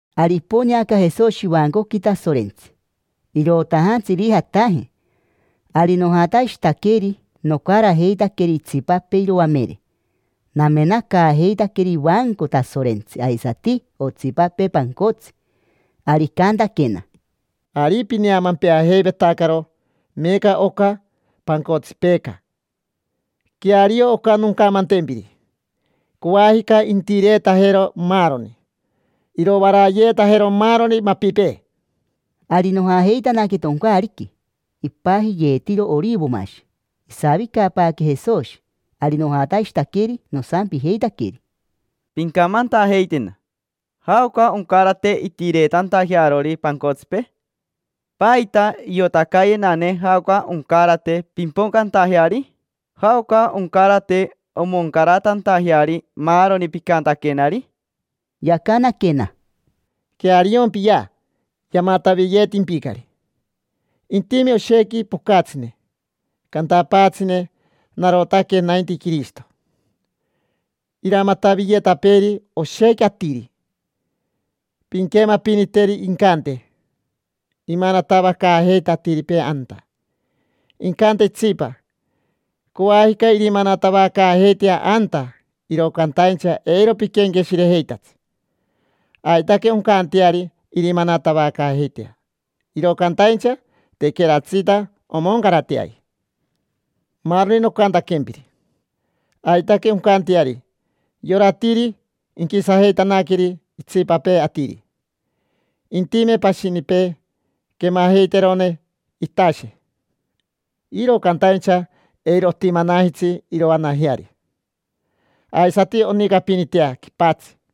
Ari iponeaca Jesoshi ivancoqui Tasorentsi, irotajantsi irijataje. Ari nojatashitaqueri, nocarajeitaqueri itsipapee iroamere, namenacaajeitaqueri ivanco Tasorentsi aisati otsipapee pancotsi. Ari icantaquena: —Ari pineamempeajeivetacaro meeca oca pancotsipeeca. Queario oca noncamantempiri: coajica intireetajero maaroni, irovarayeetajero maaroni mapipee. Ari nojajeitanaque toncaariqui ipajiyeetiro Orivomashi. Isavicapaaque Jesoshi, ari nojatashitaqueri, nosampijeitaqueri: —Pincamantajeitena: ¿jaoca oncarate intireetantajearori pancotsipee? ¿Paita iotacayenane jaoca oncarate pimpocantajeari? ¿Jaoca oncarate omoncaratantajeari maaroni picantaquenari? Yacanaquena: —Queariompiya, yamataviyeetimpicari. Intime oshequi pocatsine, cantapaatsine: “Narotaque nainti Quirishito”. Iramataviyetapeeri oshequi atiri. Pinquemapiniteri incante: “Imanatavacaajeita atiripee anta”. Incante itsipa: “Coajica irimanatavacaajeitea anta”. Iro cantaincha eiro piquenqueshirejeitatsi. Aitaque oncanteari irimanatavacaajeitea, iro cantaincha tequeratsita omoncarateaji maaroni nocantaquempiri. Aitaque oncanteari yora atiri inquisajeitanaqueri itsipapee atiri; intime pashinipee quemajeiterone itashe, iro cantaincha eiro otimanajitsi iroanajeari; aisati onicapinitea quipatsi;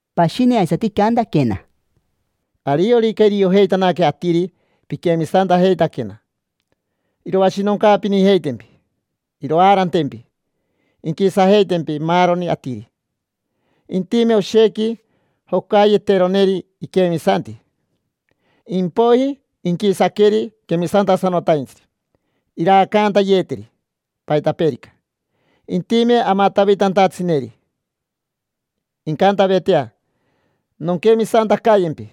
Pashini aisati icantaquena: —Ariorica iriojeitanaque atiri piquemisantajeitaquena, iroashinoncaapinijeitempi, iroaarantempi, inquisajeitempi maaroni atiri. Intime oshequi jocayeteroneri iquemisanti, impoiji inquisaqueri quemisantasanotaintsiri, iraacantayeteri, paitapeerica. Intime amatavitantatsineri, incantavetea: “Nonquemisantacayempi”,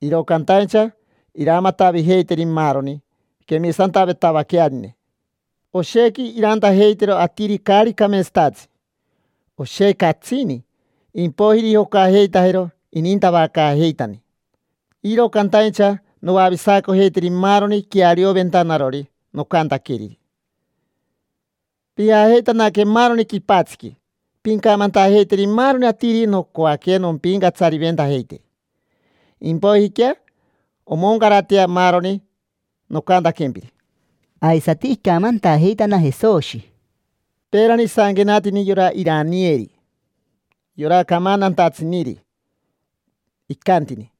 iro cantaincha iramatavijeiteri maaroni quemisantavetavaquearine. Oshequi irantajeitero atiri caari cameetsatatsi, oshequi catsini, impoiji irijocajeitajero inintavacaajeitani. Iro cantaincha noavisacojeiteri maaroni quearioventanarori nocantaqueriri. Pijajeitanaque maaroni quipatsiqui, pincamantajeiteri maaroni atiri nocoaque nompincatsariventajeiteri; impoijiquea omoncaratea maaroni nocantaquempiri. Aisati icamantajeitana Jesoshi: —Peerani isanquenatini yora Iranieri, yora camantantatsiniri, icantini: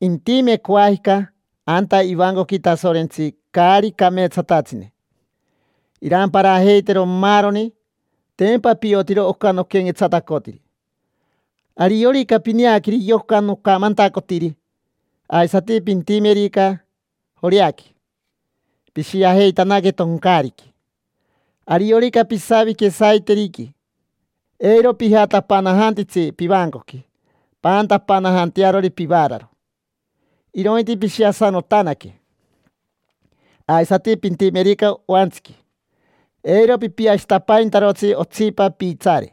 “Intime coajica anta ivancoqui Tasorentsi caari cameetsatatsine, iramparajeitero maaroni”. Tempa piotiro oca noquenquetsatacotiri. Ariorica pineaqueri yoca nocamantacotiri, aisati pintimerica Joreaqui, pishiajeitanaque toncaariqui. Ariorica pisavique saiteriqui, eiro pijatapanajantitsi pivancoqui paantapanajantearori pivaararo, irointi pishiasanotanaque. Aisati pintimerica oantsiqui, eiro pipiashitapaintarotsi otsipa piitsaare.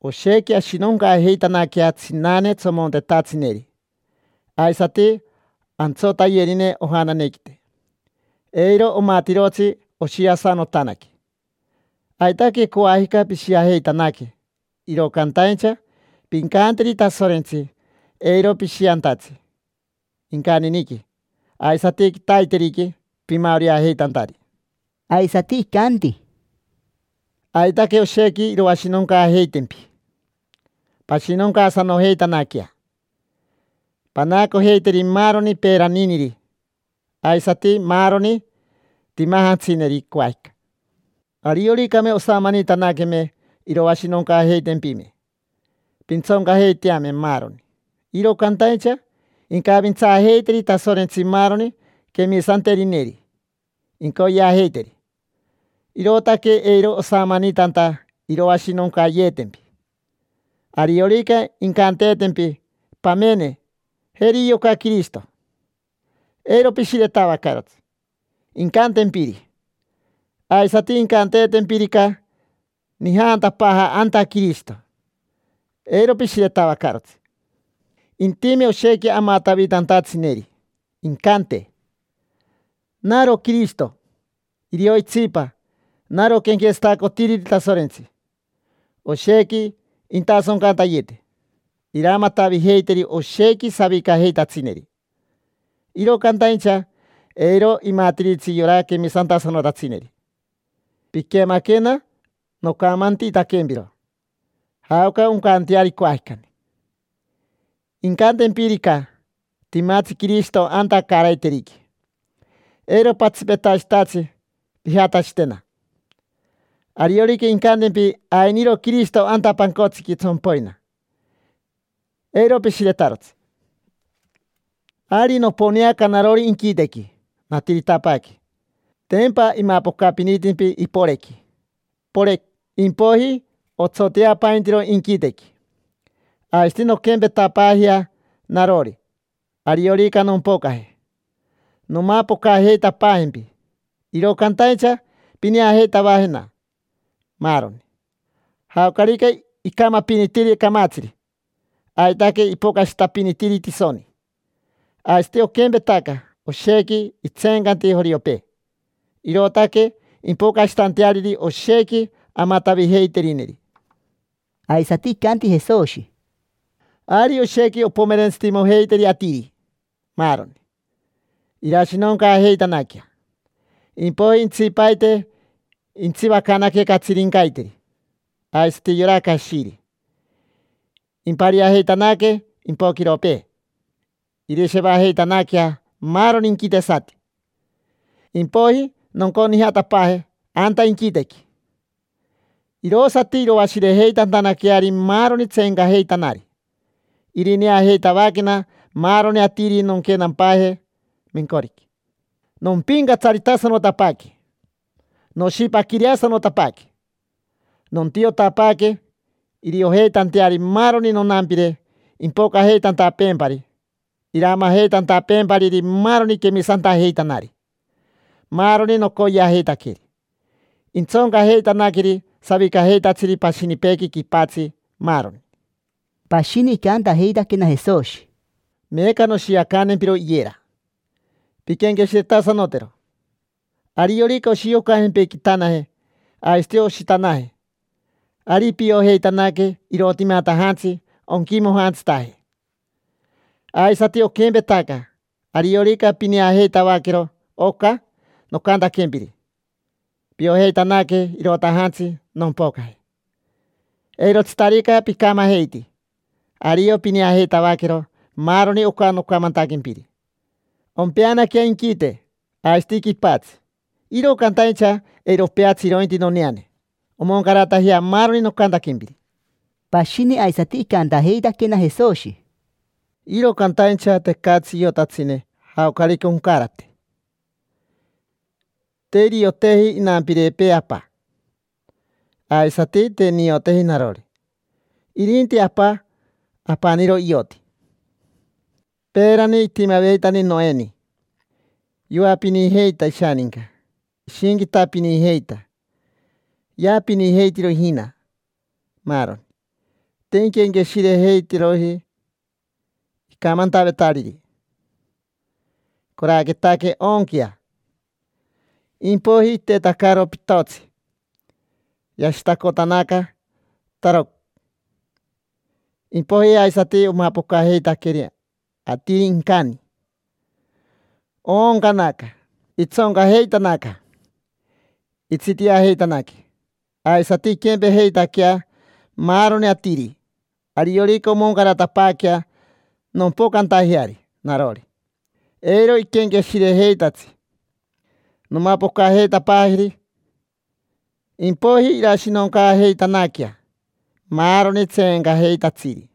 Oshequi ashinoncaajeitanaquea tsinane tsomontetatsineri aisati antsotayerine ojananequite: eiro omatirotsi oshiasanotanaque. Aitaque coajica pishiajeitanaque, iro cantaincha pincanteri Tasorentsi eiro pishiantatsi incaniniqui aisati quitaiteriqui pimaoreajeitantari. Aisati icanti: —Aitaque oshequi iroashinoncaajeitempi. Pashinoncaasanojeitanaquea, panaacojeiteri maaroni peeraniniri aisati maaroni timajantsineri coajica. Arioricame osamanitanaqueme iroashinoncaajeitempime, pintsoncajeiteame maaroni; iro cantaincha incavintsaajeiteri Tasorentsi maaroni quemisanterineri incoyeajeiteri, irootaque eiro osamanitanta iroashinoncayeetempi. Ariorica incanteetempi: “Pamene, jeri yoca Quirishito”, eiro pishiretavacarotsi incantempiri. Aisati, incanteetempirica: “Nijaantapaaja anta Quirishito”, eiro pishiretavacarotsi. Intime oshequi amatavitantatsineri, incante: “Naro Quirishito”, irio itsipa: “Naro quenquetsatacotiriri Tasorentsi”. Oshequi intasoncantayete, iramatavijeiteri oshequi savicajeitatsineri, iro cantaincha eiro imatiritsi yora quemisantasanotatsineri. Piquemaquena nocamantitaquempiro jaoca oncanteari coajicani. Incantempirica: “Timatsi Quirishito anta caaraiteriqui”, eiro patsipetashitatsi pijatashitena. Ariorica incantempi: “Ainiro Quirishito anta pancotsiqui tsompoina”, eiro pishiretarotsi. Ari noponeaca narori inquitequi, natiritapaaque. Tempa imapocapinitimpi iporequi, porec, impoiji otsoteapaintiro inquitequi: aisati nonquempetapaajea narori, ariorica nompocaje. Nomapocajeitapaajempi, iro cantaincha pineajeitavajena, maaroni. Jaocarica icamapinitiri camatsiri, aitaque ipocashitapinitiri tisoni. Aisati oquempetaca, oshequi itseencanti joriopee, irootaque impocashitanteariri oshequi amatavijeiterineri. Aisati icanti Jesoshi: —Ari oshequi ompomerentsitimojeiteri atiri, maaroni: irashinoncaajeitanaquea. Impoiji intsipaite intsivacanaque catsirincaiteri, aisati yora cashiri; impariajeitanaque impoquiropee, irishevajeitanaquea maaroni inquitesati. Impoiji nonconijatapaaje anta inquitequi, irosati iroashirejeitantanaqueari maaroni tseencajeitanari. Irineajeitavaquena maaroni atiri nonquenapaaje mencoriqui: nompincatsaritasanotapaaque, noshipaquireasanotapaaque. Nontiotapaaque iriojeitanteari maaroni nonampire impocajeitantapeempari iramajeitantapeempariri maaroni quemisantajeitanari, maaroni nocoyeajeitaqueri. Intsoncajeitanaqueri savicajeitatsiri pashinipeequi quipatsi, maaroni. Pashini icantajeitaquena Jesoshi: —Meeca noshiacantempiro iyera: pinquenqueshiretasanotero. Ariorica oshiocajempequitanaje, aisati oshitanaje, ari piojeitanaque irotimatajantsi onquimojantsitaje. Aisati oquempetaca: ariorica pineajeitavaquero oca nocantaquempiri, piojeitanaque irotajantsi nompocaje. Eirotsitarica picamajeiti, ario pineajeitavaquero maaroni oca nocamantaquempiri. Ompeanaquea inquite aisati quipatsi, iro cantaincha eiro opeatsi irointi noneane. Omoncaratajea maaroni nocantaquempiri. Pashini aisati icantajeitaquena Jesoshi: —Iro cantaincha tecatsi iotatsine jaocarica oncarate: te irioteji inampirepee Apa, aisati te nioteji narori. Irinti Apa apaniro ioti. Peerani itimaveitani Noeni, yoapinijeita ishaninca, ishinquitapinijeita, yaapinijeitiro ijina, maaroni. Te inquenqueshirejeiteroji icamantavetariri: “Coraquetaque oonquea”. Impoiji itetacaro pitotsi, yashitacotanaca, tarocn. Impoiji aisati omapocajeitaqueri atiri incani, ooncanaca, itsoncajeitanaca, itsitiajeitanaque. Aisati inquempejeitaquea maaroni atiri, ariorica omoncaratapaaquea nompocantajeari narori: eiro iquenqueshirejeitatsi, nomapocajeitapaajeri. Impoiji irashinoncaajeitanaquea maaroni tseencajeitatsiri.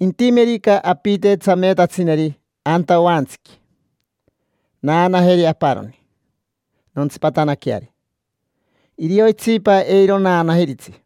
Intimerica apite tsameetatsineri anta oantsiqui: naanajeri aparoni nontsipatanaqueari, irio itsipa eiro naanajiritsi.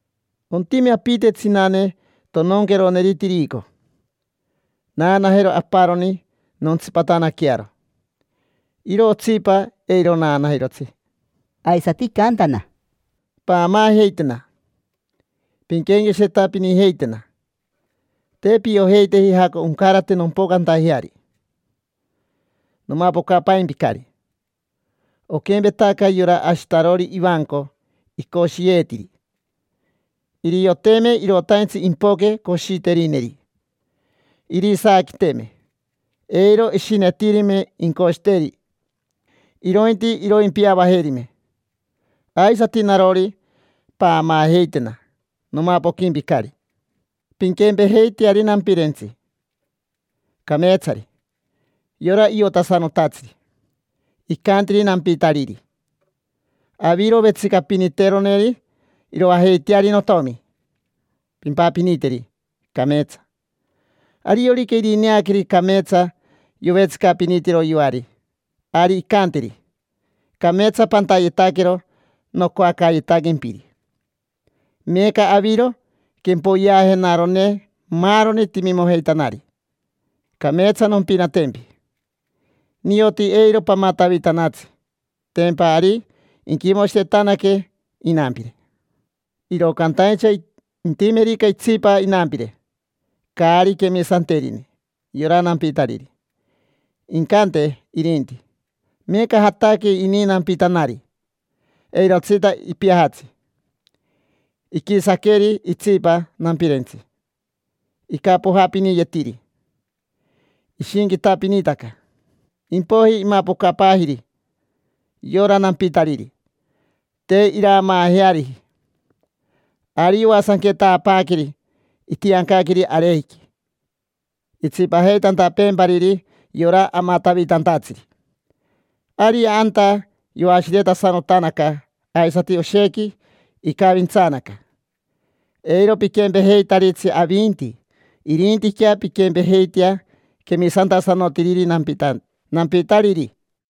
Ontime apite tsinane tononqueroneri tirico: naanajero aparoni nontsipatanaquearo, iro otsipa eiro naanajirotsi. Aisati icantana: —Paamaajeitena, pinquenqueshiretapinijeitena: te piojeiteji jaoca oncarate nompocantajeari. Nomapocapaimpicari. Oquempetaca yora ashitarori ivanco icoshiyeetiri: irioteme irotaintsi impoque coshiterineri, irisaaquiteme, eiro ishinetirime incoshiteri, irointi iroimpiavajerime. Aisati narori, paamaajeitena: nomapoquimpicari. Pinquempejeiteari nampirentsi cameetsari, yora iotasanotatsiri. Icantiri nampitariri: “Aviro vetsicapiniteroneri iroajeiteari notomi, pimpapiniteri cameetsa”. Ariorica irineaqueri cameetsa yovetsicapinitiro yoari, ari incanteri: “Cameetsa pantayetaquero nocoacayetaquempiri. Meeca aviro quempoyeajenarone maaroni timimojeitanari. Cameetsa nompinatempi, nioti eiro pamatavitanatsi”. Tempa ari inquimoshiretanaque inampire. Iro cantaincha intimerica itsipa inampire, caari quemisanterine yora nampitariri. Incante irinti: “Meeca jataque ini nampitanari, eirotsita ipiajatsi”. Iquisaqueri itsipa nampirentsi, icapojapiniyetiri, ishinquitapinitaca. Impoiji imapocapaajiri yora nampitariri: te iraamaajeariji. Ari yoasanquetapaaqueri, itiancaqueri arejiqui itsipajeitantapeempariri yora amatavitantatsiri. Ari anta yoashiretasanotanaca aisati oshequi icavintsaanaca. Eiro piquempejeitaritsi avinti, irintiquea pinquempejeitea quemisantasanotiriri nampitariri.